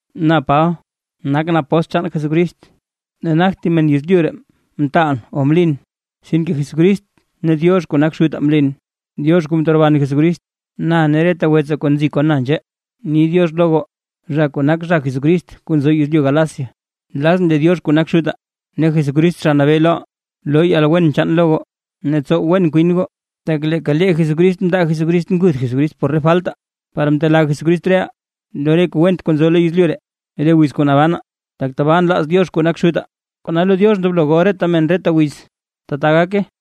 Na Paba, nakʼn apóstl chaan Jesucrist ne nagt thib men yezlyu ree mtaalʼn o mlin. Sinke Jesucrist ne Diox kuu nak Xutaa mlin, Diox kuu mteroban Jesucrist. Na ne reta wetsaa kuu nzi kon na nzhee ni “diox” lo goo, zha kuu nak zha Jesucrist kuu nzo yezlyu Galacia. Nlazʼn lee Diox kuu nak Xutaa ne Jesucrist Zha Nabee loʼaa, loo yalwen chaan lo goo ne tsow wen kwin goo. Tak leeka lee Jesucrist mndaa Jesucrist Jesucrist nguth por re faltaa, par mtelaa Jesucrist reʼaa lo re kuu went kuu nzo lo yezlyu ree re wiz kuu nabanaa, tak tabaa nlaaz Diox kuu nak Xutaa. ¡Kona lo Diox ndoblo gol reta men reta wiz! ¡Tata gake!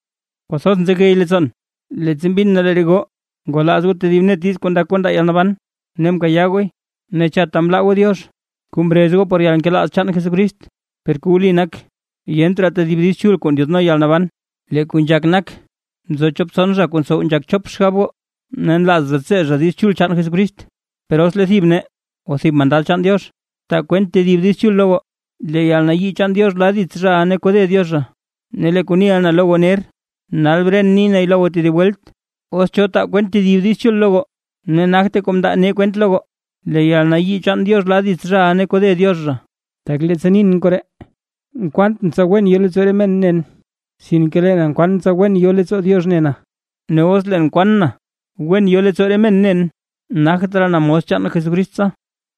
Kwathoz nzegey leettsoon, leettsa mbin na lee re goo ngwalaaz goo tedib net diiz kuu ndak goo ndaa yalnaban ne mkayaa gooy, ne chatta mlaa goo Diox kuu mrez goo por yalnkelaaz chaan Jesucrist. Per kuu wli nak, yent raa tedib Diiz Chul kuu ndyaadno yalnaban. Lee kuu nzhak nak, nzo chop tson zha kuu ntsow nzhak chop xgab goo, ne nlaaz zha tsee zha Diiz Chul chaan Jesucrist. Per os lee thib nee o thib mandad chaan Diox, taa kwent tedib diiz Diiz Chul lo goo, lee yalnayii chaan Diox la dits zhaʼa ne kode Diox zha. Ne lee kuu niʼa na lo goo ner, nal bren ni nay lo goo tedib welt: Os cho taa kwent tedib Diiz Chul lo goo ne nagte kuu mndaa nee kwent lo goo, lee yalnayii chaan Diox la dits zhaʼa ne kode Diox zha. Tak leettsa nin koree, nkwantʼn tsa wen yo leettsoo re men nen, sinke lee na nkwaan tsa wen yo leettsoo Diox ne Diox na. ¡Ne os leen nkwaan na wen yo leettsoo re men nen, nagt raa na mos chaan Jesucrist tsa!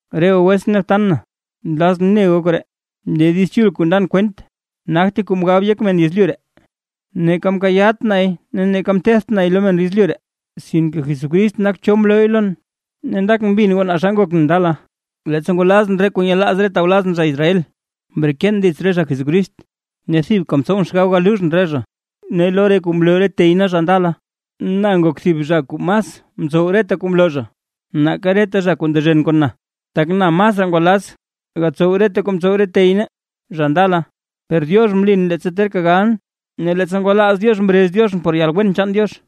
Re goo wetsʼn ne btan na, nlazʼn ne goo koree: Lee Diiz Chul kuu ndan kwent, nagte kuu mgab yek men yezlyu ree. Tak neeka mkayaat nay ne neeka mteedt nay lo men yezlyu ree, sinke Jesucrist nak cho mlooy lon. Ne ndakʼn mbin goo naa xa ngokʼn ndala, leettsa ngwalazʼn re kuu nyelaaz re tawlazʼn zha Israel, mreken dits re zha Jesucrist, ne thibka mtsowʼn xgab galuuzhʼn re zha. Ne lo re kuu mloo re tey nee zha ndala, na ngok thib zha kuu mas mtsow reta kuu mloo zha, nake reta zha kuu ndezhen kon na, tak na masraa ngwalaaz gatsow reta kuu mtsow re tey nee, zha ndala. Per Diox mlin leettsa terka galʼn, ne leettsa ngwalaaz Diox mrez Dioxʼn por yalwen chaan Diox,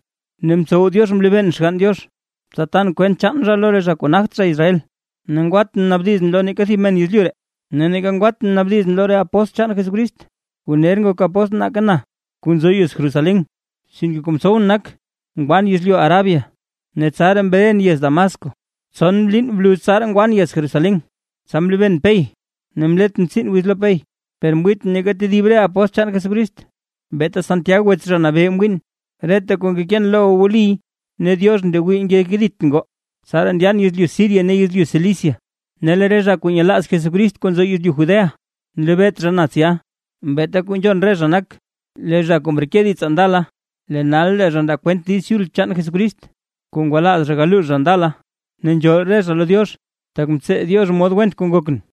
ne mtsow Diox mlebeen Xgann Diox, tsa tan kwent chaan zha lo re zha kuu nagt zha Israel. Ne ngwatʼn mnaabdizʼn lo neeka thib men yezlyu ree; ne neeka ngwatʼn mnaabdizʼn lo re apóstl chaan Jesucrist kuu ner ngok apóstl nake na, kuu nzo yez Jerusalén. Sinke kuu mtsowʼn nak ngwan yezlyu Arabia, ne tsaraa mren yez Damasco. Tson liin bluz tsaraa ngwan yez Jerusalén, tsa mlebeen Pey, ne mletʼn tsiin wiz lo Pey. Per mwiitʼn neeka tedib re apóstl chaan Jesucrist, beeta Santiag wets Zha Nabee mwiin. Reta kuu ngekeen lo goo wliy ne Diox ndewii ngekeditʼn goo. Tsaraa ndyan yezlyu Siria ne yezlyu Cilicia. Ne lee re zha kuu nyelaaz Jesucrist kuu nzo yezlyu Judea, nlebeet zha na tsya. Beeta kuu nzhon re zha nak: “Lee zha kuu mreke ditsaa ndala, lee nal lee zha ndaa kwent Diiz Chul chaan Jesucrist, kuu ngwalaaz zha galuux zha ndala”. Ne nzhool re zha lo Diox, tak mtsee Diox mod went kuu ngokʼn.